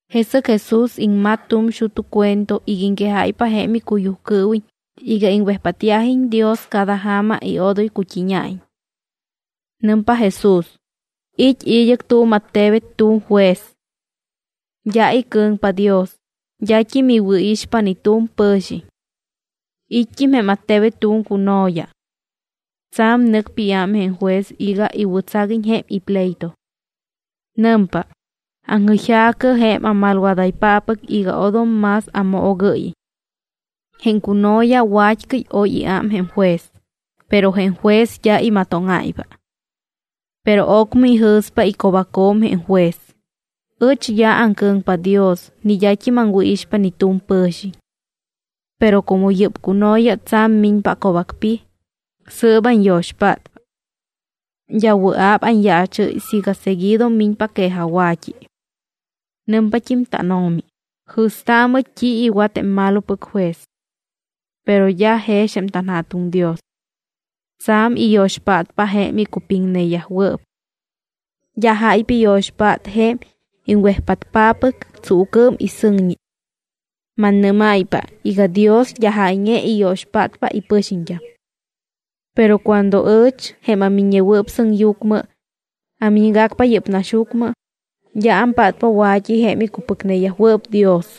Jesɨc Jesús iŋmat tu̱m xut́u cuento iga iŋquejáypa jém icuyujcɨɨwiñ iga iŋwejpátyajiñ Dios cada ja̱ma y odoy cut́íña̱iñ. Nɨmpa Jesús: —It́ id́ɨc tu̱m attebet tu̱m juez. D́a icɨ̱ŋpa Dios, d́at́im iwɨ̱ixpa ni tu̱m pɨ̱xiñ. It́t́im jém attebet tu̱m cuno̱ya. Tsa̱m nɨcpa iám jém juez iga iwɨ̱tsaguiñ jém ipleito. Nɨmpa: “Aŋjɨyja̱cɨ jém amalwadaypáppɨc iga odom más amoogɨ́yiñ.” Jém cuno̱ya wa̱t́cɨy oy iám jém juez, pero jém juez d́a imatóŋáypa. Pero ocmɨ ijɨ̱spa ico̱bacjo̱m jém juez: “Ɨch d́a aŋcɨ̱ŋpa Dios ni d́at́im aŋwɨ̱ixpa ni tu̱m pɨ̱xiñ, pero como yɨ́p cuno̱ya tsa̱m miñpa aco̱bacpij, sɨɨp anyo̱xpátpa. D́a wɨa̱p anyaachɨ́y siiga seguido miñpa quejajwa̱t́i.” Nɨmpat́im tánO̱mi: —Jɨ̱staamɨ t́i iwat jém malopɨc juez. Pero d́a jex jém tanJa̱tuŋ Dios. Tsa̱m iyo̱xpátpa jém icupiŋneyajwɨɨp. D́a jáypa iyo̱xpát jém iŋwejpátpáppɨc tsuucɨɨm y sɨŋñi. Mannɨ́máypa iga Dios d́a jáyñe iyo̱xpátpa ipɨxiñt́am. Pero cuando ɨch, jém aMiññewɨɨp Sɨŋyucmɨ, amiñgacpa yɨ́p naxyucmɨ, d́a ampátpa wa̱t́i jém icupɨcneyajwɨɨp Dios.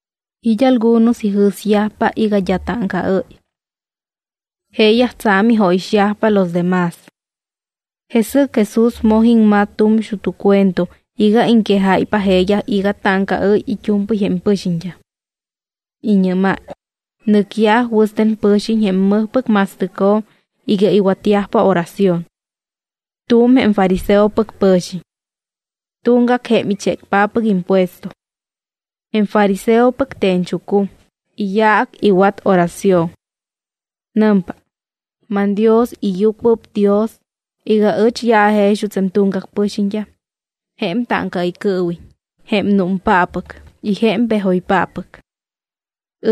It́ algunos ijɨ̱syajpa iga d́a táŋcaɨ́y. Jeeyaj tsa̱m ijóyixyajpa los de más. Jesɨc Jesús moj iŋmat tu̱m xut́u cuento iga iŋquejáypa jeeyaj iga táŋcaɨ́y it́u̱mpɨy jém pɨxiñt́am. Iñɨ́máy: —Nɨcyaj wɨste̱n pɨ̱xiñ jém mɨjpɨc ma̱stɨcjo̱m iga iwatyajpa oración. Tu̱m jém fariseopɨc pɨ̱xiñ. Tuŋgac jém ichécpáppɨc impuesto. Jém fariseopɨc te̱ñchucum, iyaac iwat oración. Nɨmpa: “ManDios, iyucuɨpdios iga ɨch d́a ajex juuts jém tuŋgac pɨxiñt́am jém táŋcaɨycɨɨwiñ, jém númpáppɨc y jém pejoypáppɨc.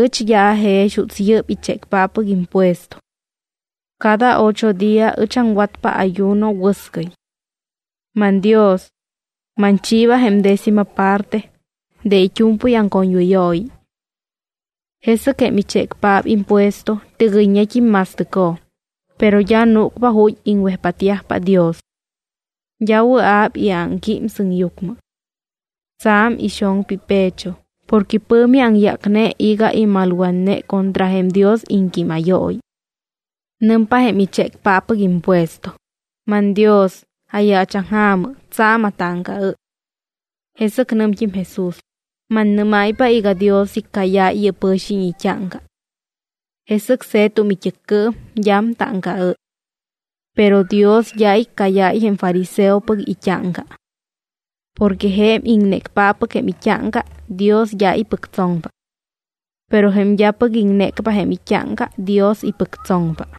Ɨch d́a ajex juuts yɨ́p ichécpáppɨc impuesto. Cada ocho día ɨch aŋwatpa ayuno wɨscɨy. ManDios, manchiiba jém décima parte de it́u̱mpɨy aŋcoñwɨyooyi.” Jesɨc jém ichécpaap impuesto tɨgɨyñet́im ma̱stɨcjo̱m, pero d́a núcpa ju̱t́ iŋwejpátyajpa Dios. D́a wɨa̱p iámquím sɨŋyucmɨ. Tsa̱m ixoŋpa ipecho porque pɨ̱mi aŋyácne iga imalwatne contra jém Dios iŋquímayooyi. Nɨmpa jém ichécpáppɨc impuesto: “ManDios, ayaachaŋja̱mɨ, tsa̱m atáŋcaɨ́y.” Jesɨc nɨmt́im Jesús: —Mannɨ́máypa iga Dios iccáyáy yɨ́p pɨ̱xiñ it́áŋca. Jesɨc se̱tum it́ɨccɨɨm, d́am táŋcaɨ́y. Pero Dios d́a iccáyáy jém fariseopɨc it́áŋca. Porque jém iŋnécpáppɨc jém it́áŋca, Dios d́a ipɨctsoŋpa. Pero jém d́apɨc iŋnécpa jém it́áŋca, Dios ipɨctsoŋpa.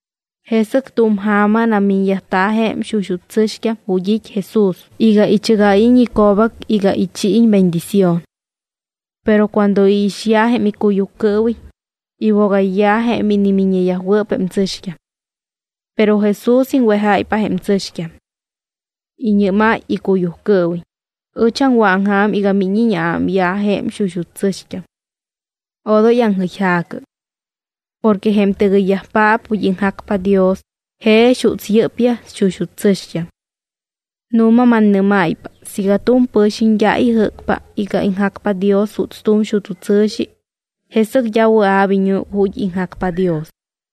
Jesɨc tu̱m ja̱ma namiñyajta̱ jém xuxut́ tsɨ̱xt́am ju̱t́ it́ Jesús iga ichɨgáyiñ ico̱bac iga ichiiñ bendición. Pero cuando iixyaj jém icuyujcɨɨwiñ, iwogayyaj jém inimiññeyajwɨɨp jém tsɨ̱xt́am. Pero Jesús iŋwejáypa jém tsɨ̱xt́am. Iñɨ́máy icuyujcɨɨwiñ: —Ɨch aŋwɨ̱aŋja̱m iga míñiñ aámyaj jém xuxut́ tsɨ̱xt́am. Odoy aŋjɨyja̱cɨ. Porque jém tɨgɨyyajpaap ju̱t́ iŋjacpa Dios jex juuts yɨ́pyaj xuxut́ tsɨ̱xt́am. Nu̱ma mannɨ́máypa siiga tu̱m pɨ̱xiñ d́a ijɨ́cpa iga iŋjacpa Dios juuts tu̱m xut́u tsɨ̱xi, jesɨc d́a wɨa̱p iñúc ju̱t́ iŋjacpa Dios.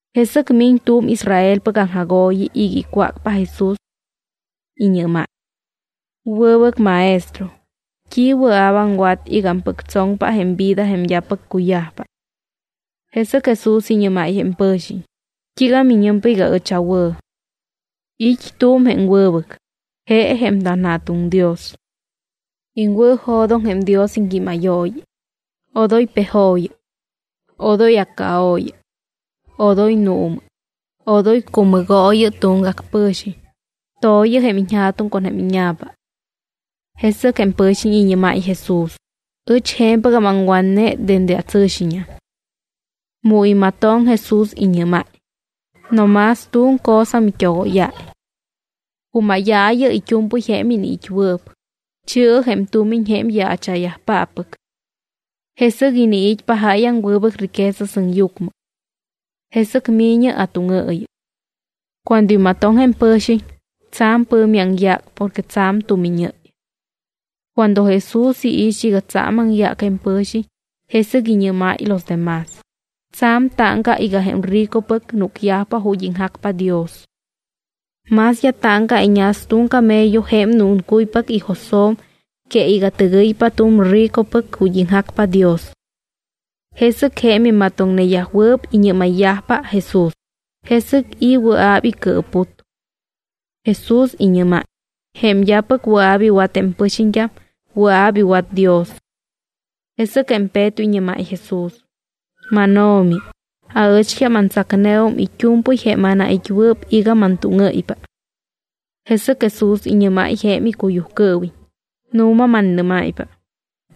Jesɨc miñ tu̱m Israelpɨc aŋjagooyi iga icwácpa Jesús. Iñɨ́máy: —Wɨbɨc Maestro, ¿t́i wɨa̱p aŋwat iga ampɨctsoŋpa jém vida jém d́apɨc cuyajpa? Jesɨc Jesús iñɨ́máy jém pɨ̱xiñ: —¿T́iiga miñɨmpa iga ɨch awɨ̱? It́ tu̱m jém wɨbɨc, je jém tanJa̱tuŋ Dios. Iŋwɨ̱jo̱doŋ jém Dios iŋquímayooyi: “Odoy pejooyɨ; odoy accaooyɨ; odoy nuumɨ; odoy cumɨgooyɨ tuŋgac pɨ̱xiñ; to̱yɨ jém iñja̱tuŋ con jém íña̱pa.” Jesɨc jém pɨ̱xiñ iñɨ́máy Jesús: —Ɨch je̱mpɨgam aŋwatne dende atsɨ̱xiñam. Mu imatoŋ, Jesús iñɨ́máy: —No más tu̱m cosa mit́ogóyáy. Cumáyaayɨ it́u̱mpɨy jém iniit́wɨɨp, chi̱ɨ jém tumiñ jém yaacha̱yajpáppɨc. Jesɨc iniit́pa jáyaŋ wɨbɨc riqueza sɨŋyucmɨ. Jesɨc mi̱ñɨ atúŋɨɨyɨ. Cuando imatoŋ jém pɨ̱xiñ, tsa̱m pɨ̱mi aŋyác porque tsa̱m tumiñɨ́y. Cuando Jesús iix iga tsa̱m aŋyác jém pɨ̱xiñ, jesɨc iñɨ́máy los de más: —Tsa̱m táŋca iga jém ricopɨc núcyajpa ju̱t́ iŋjacpa Dios. Más dá táŋca iñas tu̱m camello jém núncuypac ijo̱sjo̱m que iga tɨgɨypa tu̱m ricopɨc ju̱t́ iŋjacpa Dios. Jesɨc jém imatoŋneyajwɨɨp iñɨ́mayyajpa Jesús: —¿Jesɨc i̱ wɨa̱p icɨɨput? Jesús iñɨ́máy: —Jém d́apɨc wɨa̱p iwat jém pɨxiñt́am, wɨa̱p iwat Dios. Jesɨc jém Peto iñɨ́máy Jesús: —MánO̱mi, aɨcht́am antsacneum it́u̱mpɨy jém anait́wɨɨp iga mantúŋɨ́ypa. Jesɨc Jesús iñɨ́máy jém icuyujcɨɨwiñ: —Nu̱ma mannɨ́máypa,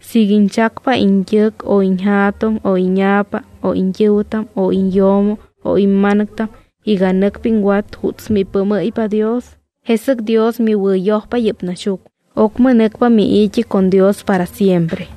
siiga iñchacpa iñt́ɨc o iñja̱tuŋ o íña̱pa o iñt́ɨ̱wɨtam o iñyo̱mo o imma̱nɨctam iga nɨcpa iŋwat juuts mipɨɨmɨ́ypa Dios, jesɨc Dios miwɨ̱yojpa yɨ́p naxyucmɨ, ocmɨ nɨcpa mii̱t́i con Dios para siempre.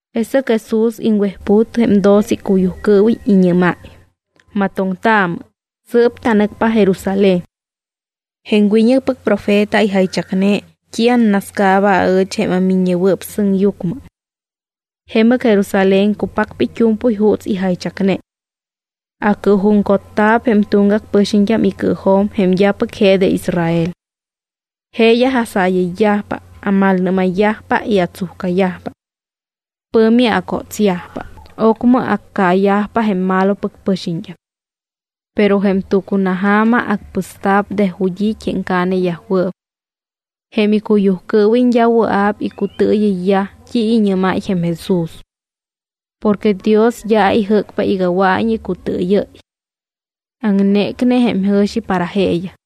Jesɨc Jesús iŋwejput jém doce icuyujcɨɨwiñ, iñɨ́máy: —Matoŋtaamɨ, sɨɨp tanɨcpa Jerusalén. Jém wiñɨcpɨc profeta ijaychacne t́i annascaaba aɨch jém aMiññewɨɨp Sɨŋyucmɨ. Jemɨc Jerusalén cupacpa it́u̱mpɨy juuts ijaychacne. Acɨɨjuŋcotta̱p jém tuŋgac pɨxiñt́am icɨɨjo̱m jém d́apɨc je de Israel. Jeeyaj asaayɨyyajpa, amalnɨ́mayyajpa y atsujcayajpa. Pɨ̱mi acótsyajpa, ocmɨ accaayajpa jém malopɨc pɨxiñt́am. Pero jém tucunaja̱ma acpɨsta̱p de ju̱t́ it́ jém caaneyajwɨɨp. Jém icuyujcɨɨwiñ d́a wɨa̱p icutɨɨyɨyyaj t́i iñɨ́máy jém Jesús. Porque Dios d́a ijɨ́cpa iga wɨa̱iñ icutɨɨyɨ́y. Aŋnécne jém jɨ̱xi para jeeyaj.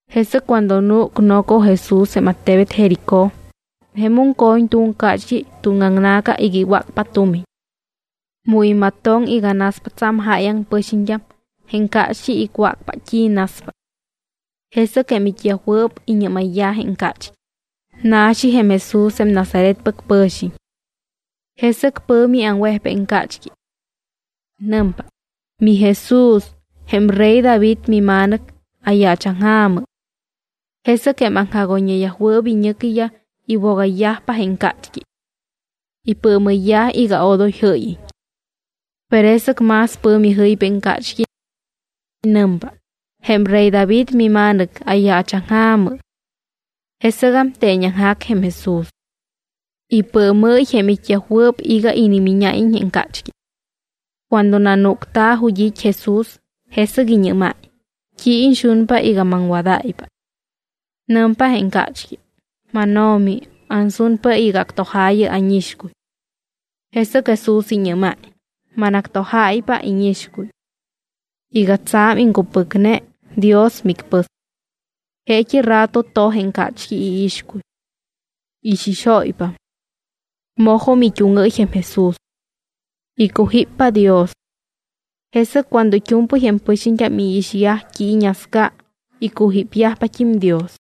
Jesɨc cuando núc noco Jesús jém attebet Jericó, jemum co̱ñ tu̱m cácht́i tuŋaŋna̱ca iga iwácpa tumiñ. Mu imatoŋ iga naspa tsa̱m jáyaŋ pɨxiñt́am, jém cácht́i icwácpa t́i naspa. Jesɨc jém it́yajwɨɨp iñɨ́mayyaj jém cácht́i: —Na̱xi jém Jesús jém Nazaretpɨc pɨ̱xiñ. Jesɨc pɨ̱mi aŋwejpa jém cácht́i. Nɨmpa: —¡MiJesús, jém rey David miMa̱nɨc, ayaachaŋja̱mɨ! Jesɨc jém aŋjagoyñeyajwɨɨp iñɨcyaj iwogayyajpa jém cácht́i. Ipɨɨmɨyyaj iga odoy jɨ́yiñ. Pero jesɨc más pɨ̱mi jɨypa jém cácht́i. Nɨmpa: —Jém rey David miMa̱nɨc, ayaachaŋja̱mɨ. Jesɨgam teeñaŋjac Jesús. Ipɨɨmɨ́y jém it́yajwɨɨp iga inimíñáyiñ jém cácht́i. Cuando nanúcta̱ ju̱t́ it́ Jesús, jesɨc iñɨ́máy: —¿T́i iñxunpa iga maŋwadáypa? Nɨmpa jém cácht́i: —MánO̱mi, ansunpa iga actojaayɨ ánixcuy. Jesɨc Jesús iñɨ́máy: —Manactojáypa íñixcuy. Iga tsa̱m iŋcupɨcne, Dios micpɨs. Jeet́i rato toj jém cácht́i iixcuy. Ixixóypam. Mojum it́úŋɨ́y jém Jesús. Icujíppa Dios. Jesɨc cuando it́u̱mpɨy jém pɨxiñt́am iixyaj t́i iñasca, icujípyajpat́im Dios.